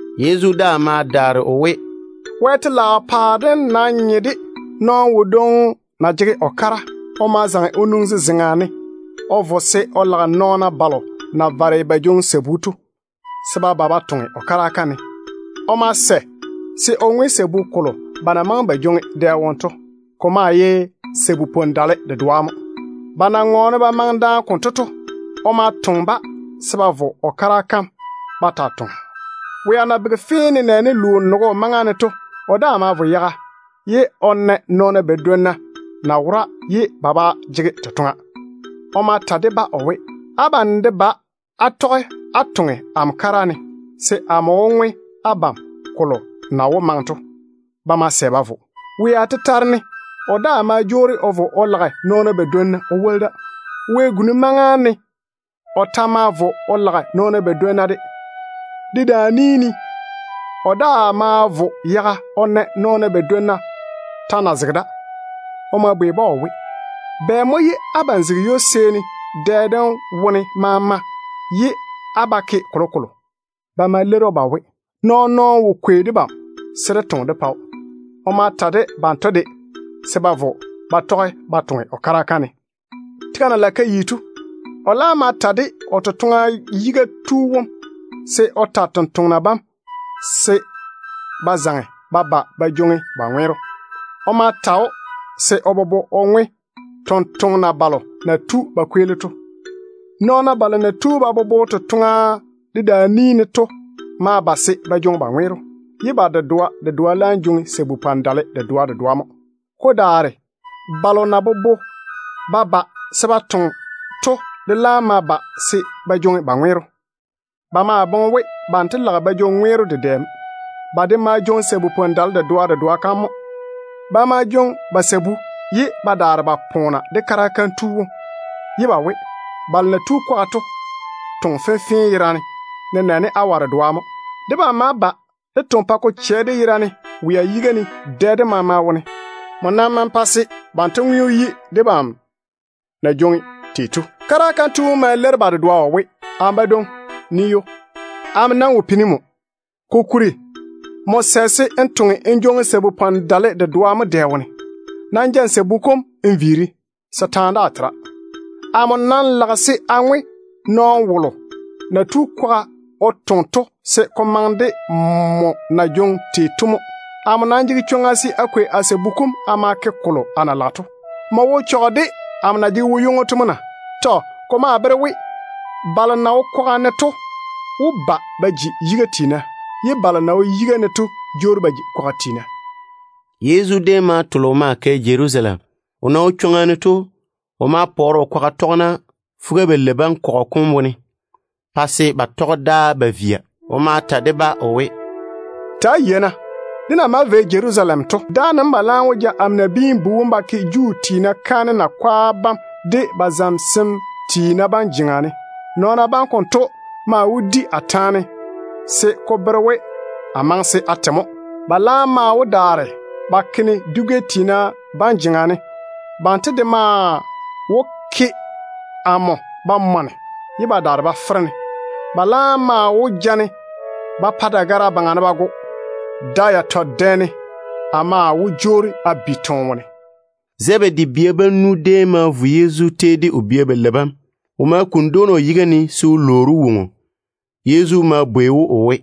Yezu daa ma ta o we, “Wɛ telaao paare dem nam nye de nɔɔno wodwoŋi na jege o kara. O ma zaŋe o nwoŋi zezeŋa ne o vo se o lage nɔɔna balo na vare ba jwoŋi sabu to, se ba ba ba toŋe o kara kam ne. O ma sɛ se o ŋwe sabu kolo ba na maŋe se ba jwoŋi dɛ wone to. Ko maa ye lu-nyenno sabu-dale dedoa mo. Ba na sɛ konto to, o ma toŋe-ba se ba vo o kara kam ba taa toŋa. Wea na bege fee nenɛɛne luu nogo maŋa ne to, o daa ma vo yaga. O ma na nɔɔna badwonna na wora ye ba ba jege totoŋa. O ma ta de-ba o we, ‘Abam de ba á tɔge á toŋe amo kara ne, se amo wó ŋwe abam kolo na wó maŋe to.’ Ba ma sɛ ba vo. Wea tetare ne o daa ma jwoori o vo o lage nɔɔna badwonna o woli da. Wɛ-guni maŋa ne o ta ma vo o lage nɔɔna badwonna de. Dedaan-ni ne o daa ma vo yaga o na nɔɔna badwonna ta na zege da. O ma bwei-ba o we, ‘Bɛ mo ye abam zege ywo-seeni dɛ dem wone maama ye á ba ke kolokolo?’ Ba ma leiri‑o ba we, ‘Nɔɔn-nɔɔno wo kwei debam se dé toŋe dé pa‑o.’ O ma ta de banto de se ba vo ba tɔge ba toŋe o kara kam ne. Tega na lage ka yi to, o laam ma ta de o totoŋa yiga tu wom se o ta tontoŋena bam se ba zaŋe ba ba ba jwoŋi ba ŋweero. O ma ta‑o se o bobo o ŋwe tontoŋena balo na tu ba kweeli to. Nɔɔna balo na tu ba bobo totoŋe dem dedaan-ni ne to ma ba se ba jwoŋi ba ŋweero, ye ba dedoa dedoa ma jwoŋi sabu-dale dedoa dedoa. Ko daare balo na bobo ba ba se ba toŋe to de laam ma ba se ba jwoŋi ba ŋweero. Ba maa boŋe we banto lage ba jwoŋi ŋweero dedɛ mo. Ba de ma jwoŋi sabu-dale dedoa dedoa. Ba ma jwoŋi ba sabu ye ba daare ba poona de kara kam tu wom ba we, ‘Balo na tu kwaga to toŋe fenfee yerane, nenɛɛne awa dedoa mo. Debam ma ba dé toŋe pa ko chɛ dé yera ne wea yiga ne dɛ dem maama wone ye nmo nam pa se banto ŋweo yi debam na jwoŋi tei to.’ Kara kam tu wom ma leiri ba dedoa o we, ‘Amo badwoŋi, nii ywo. Amo wo pini nmo, kokuri nmo sɛ se n toŋe n jwoŋi sabu-dale dedoa mo dɛ wone. Nam ja n sabu kom n viiri, se taane daa tera. Amo lage se a ŋwe nɔɔno wolo na tu kwaga o toŋe to se ko maŋe de nmo na jwoŋi tei to mo. Amo nam jege chwoŋa se a kwei a sabu kom a ma ke kolo a na lage to. Nmo wo chɔge de amo na jege wo-ywoŋo to mo na?’ Tɔ. Ko maa bere we balo na wo kwaga ne to wó ba ba ji yiga tiina, ye balo na wo yiga ne to jwoori ba ji kwaga tiina.” Yezu déem ma tole o maa kɛ Jerusalem. O na wo chwoŋa ne to, o ma pɔɔre o kwaga tɔgena fuga-balei bam kɔgɔ kom wone, o pa ba tɔge ded‑o ba via. O ma ta de-ba o we, “Ta‑á yei-na, dé na maa vei Jerusalem to, dáane mo ba laam wó ja amo Nabiin-bu wom ba ke Juu tiina kaanem yiga tiina bam de ba zamesem tiina bam jeŋa ne. Nɔɔna bam konto maa wó di a taane se ko bere we a maŋe se a te mo. Ba laam maa wó daare ba ke-ne dwi-gɛ tiina bam jeŋa ne. Banto de maa wó ke amo ba mɔne ye ba daare ba fere-ne. Ba laam maa wó ja-ne ba pa dagara yuu ne ba go. Da yatɔ dɛ ne a maa wó jwoori a bi toone wone.” Zebedi bia bam nu déem ma vo Yezu tei de o bia balei bam. O ma kuni dwoona o yiga ne se o lwoori‑o woŋo. Yezu ma bwei‑o o we,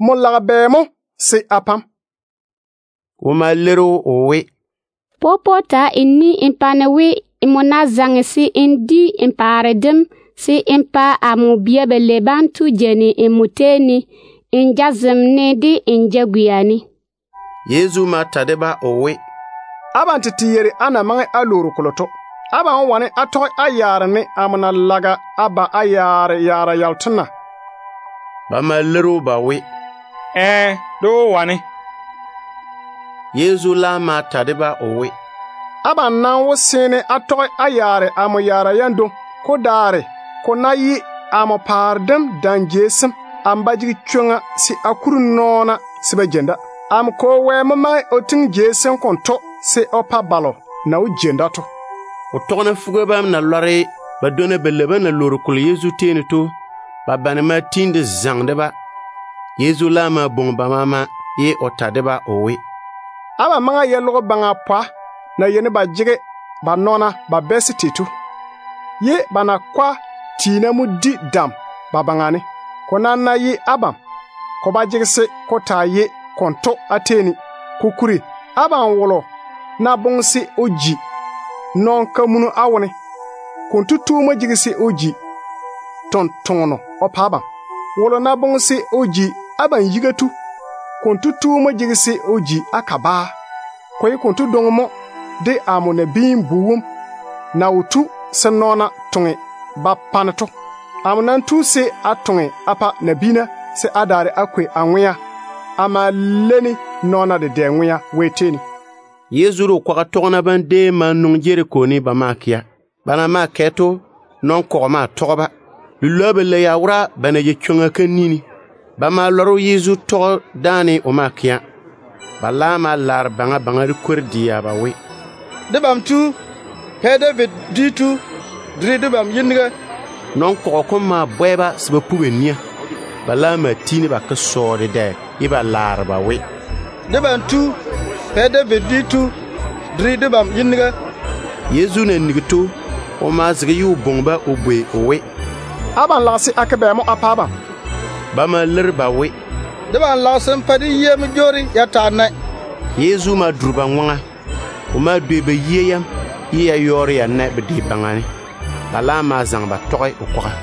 “Nmo lage bɛ mo se a pa‑m?” O ma leiri‑o o we, “Popo ta n ni n pa amo we, nmo ná tu n di n paare dem, se n pa amo bia balei banto jeini nmo tei ne, n jazem de n jagwia ne.” Yezu ma ta de-ba o we, “Abam nam yeiri á na lwoori kolo to. Abam wó wane á tɔge á yaare ne amo na lage a yaare tei to na?” Ba ma leiri‑o ba we, “Ɛɛ, dé wó wane.” Yezu laam ma ta de-ba o we, “Abam nam wó seene á tɔge á yaare amo yaara yam dwoŋi. Ko daare ko ná ye jeiŋa jei amo paare dem ne, amo ba jege chwoŋa se a kuri nɔɔna se ba jeini da. Amo Kwo Wɛ mo maŋe o tiŋi jei sem konto se o pa balo na wó jeini da to.” O tɔgena fuga bam na lɔre ba dwonna balei bam na lwoori kolo Yezu tei ne to, ba bane ma tiini de zaŋe de-ba. Yezu laam ma bwoŋi ba maama, ye o ta de-ba o we, “Abam maŋe á yei logo baŋa pwa na yeini ba jege ba nɔɔna ba bɛɛse tei to, ye ba dedɛɛra mo di dam ba baŋa ne. Ko nam ná ye abam, ko ba jege se ko taa ye konto á tei ne. Kokuri abam wolo ná boŋe se o ji nɔn-kamunu á wone, konto tu mo jege se o ji tontoŋeno o pa abam. Wolo ná boŋe se o ji abam yiga tu, konto tu mo jege se o ji á kabaa. Ko ye konto dwoŋi mo de amo Nabiin-bu wom na wo tu se nɔɔna toŋe ba pa-ne to. Amo nam tu se a toŋe a pa nabiina, se a daare a kwei a ŋwea a ma leini nɔɔna dedɛ ŋwea.” Yezu de o kwaga tɔgena bam déem ma nwoŋi Jeriko ne ba maa kɛa. Ba na maa kɛ to, nɔn-kɔgɔ dedɛ mo tɔge-ba. Lilwoa balei ya wora ba na jei chwoŋa kam ni ne. Ba ma lɔre we Yezu tɔge dáane o maa kɛa. Ba laam ma laare baŋa baŋa de kwor-dɛa ba we, “Debam tu! Pɛ David dwi tu! Duri debam yiniga!” Nɔn-kɔgɔ kom ma bwɛ-ba se ba pu ba ni. Ba laam ma fɔge ba ke sɔɔ dedɛ ye ba laare ba we, “Debam Tu! Pɛ David dwi tu! Duri debam yiniga!” Yezu na nigi to, o ma zege ye o bwoŋi-ba o bwei o we, “Abam lage se a ke bɛ mo a pa abam?” Ba ma leiri ba we, “Debam lage se n pa dé yia mo jwoori ya taa nae.” Yezu ma duri ba ŋwaŋa. O ma dwei ba yia yam, ye ya yɔɔre ya nae bedwe baŋa ne. Ba laam ma zaŋe ba tɔge o kwaga.